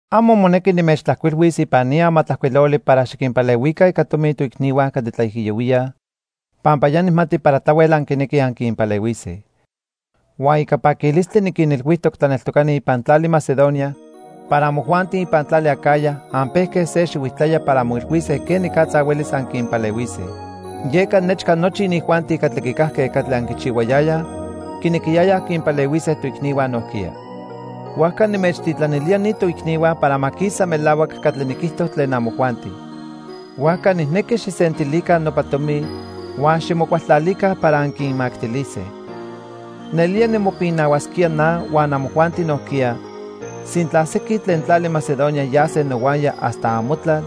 Amo monequi nimechtlajcuilhuis ipan ni amatlajcuiloli para xiquinpalehuica ica tomi toicnihua catli tlaijiyohuíaj, pampa ya nijmati para tlahuel anquinequij anquinpalehuise. Huan ica paquilistli niquinilhuijtoc tlaneltocani ipan tlali Macedonia para amojuanti ipan tlali Acaya anpejque se xihuijtlaya para anmoilhuise quenicatza huelis anquinpalehuise. Yeca nechca nochi inijuanti catli quicajque catli anquichihuayayaj, quinequiyayaj quinpalehuise toicnihua nojquiya. Huajca nimechtitlanilía ni toicnihua para ma quisa melahuac catli niquijto tlen amojuanti. Huajca nijnequi xijsentilica nopa tomi huan ximocualtlalica para anquinmactilise. Nelía nimopinahuasquía na huan amojuanti nojquiya, sintla sequin tlen tlali Macedonia yase nohuaya hasta amotlal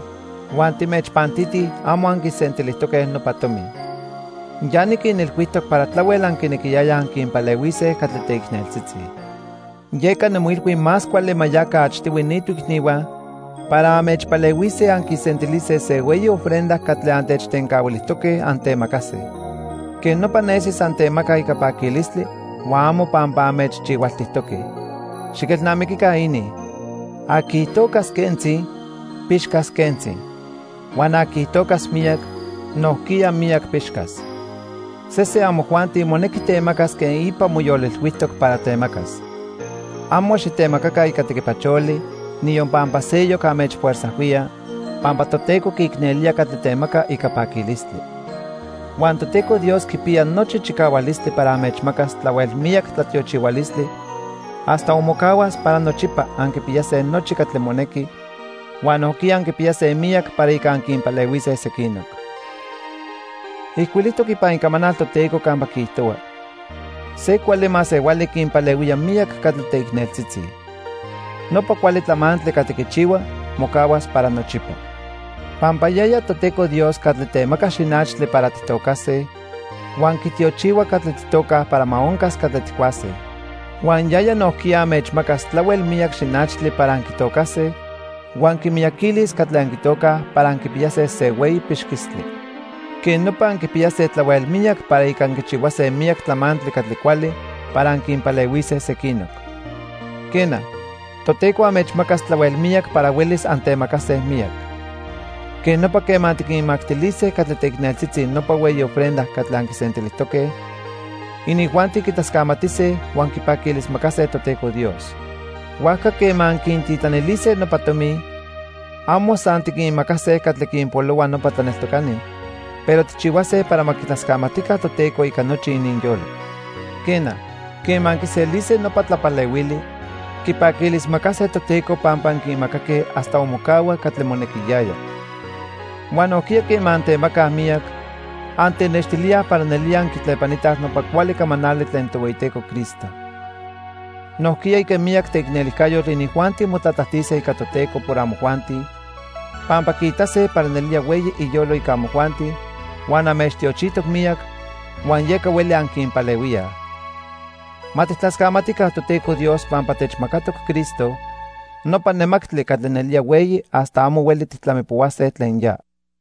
huan timechpantitij amo anquisentilijtoque nopa tomi. Ya niquinilhuijtoc para tlahuel anquinequiyayaj anquinpalehuise catli teicneltzitzi. Yeca nimoilhui más cuali ma yaca achtihui ni toicnihua para anmechpalehuise anquisentilise se hueyi ofrenda catli antechtencahuilijtoque antemacase. Quej nopa nesis antemacaj ica paquilistli huan amo pampa anmechchihualtijtoque. Xiquelnamiquica inin: Aqui tocas quentzi, pixcas quentzi. Huan aqui tocas miyac, nojquiya miyac pixcas. Sesen amojuanti monequi temacas quen ipa moyolilhuijtoc para temacas. Amo xitemacaca ica tequipacholi, niyon pampa seyoc anmechfuerzajhuía, pampa Toteco quiicnelía catli temaca ica paquilistli. Huan Toteco Dios quipiya nochi chicahualistli para anmechmacas tlahuel miyac tlatiochihualistli hasta onmocahuas para nochipa anquipiyase nochi catli monequi, huan nojquiya anquipiyase miyac para ica anquinpalehuise sequinoc. Ijcuilijtoc ipan Icamanal Toteco campa quiijtohua: "Se cuali masehuali quinpalehuía miyac catli teicneltzitzi. Nopa cuali tlamantli catli quichihua mocahuas para nochipa." Pampa yaya Toteco Dios catli temaca xinachtli para tijtocase huan quitiochihua catli tijtocaj para ma oncas catli tijcuase. Huan yaya nojquiya anmechmacas tlahuel miyac xinachtli para anquitocase huan quimiyaquilis catli anquitocaj para anquipiyase se hueyi pixquistli. Quej nopa anquipiyase tlahuel miyac para ica anquichihuase miyac tlamantli catli cuali para anquinpalehuise sequinoc. Quena, Toteco anmechmacas tlahuel miyac para huelis antemacase miyac. Quej nopa, quema tiquinmactilise catli teicneltzitzi nopa hueyi ofrenda catli anquisentilijtoque, inijuanti quitlascamatise huan quipaquilismacase Toteco Dios. Huajca quema anquintitlanilise nopa tomi, amo san tiquinmacase catli quinpolohua nopa tlaneltocani, pero tijchihuase para ma quitlascamatica Toteco ica nochi ininyolo. Quena, quema quiselise nopa tlapalehuili, quipaquilismacase Toteco pampa anquinmacaque hasta onmocahua catli monequiyaya. Huan nojquiya quema antemacaj miyac, antenextilíaj para nelía anquitlepanitaj nopa cuali camanali tlen Tohueyiteco Cristo. Nojquiya ica miyac teicnelijcayotl inijuanti motlatlajtise ica Toteco por amojuanti, pampa quiitase para nelía hueyi iyolo ica amojuanti huan anmechtiochijtoc miyac, huan yeca hueli anquinpalehuíaj. Ma tijtlascamatica Toteco Dios pampa techmacatoc Cristo, nopa nemactli catli nelía hueyi hasta amo hueli tijtlamipohuase tlen ya.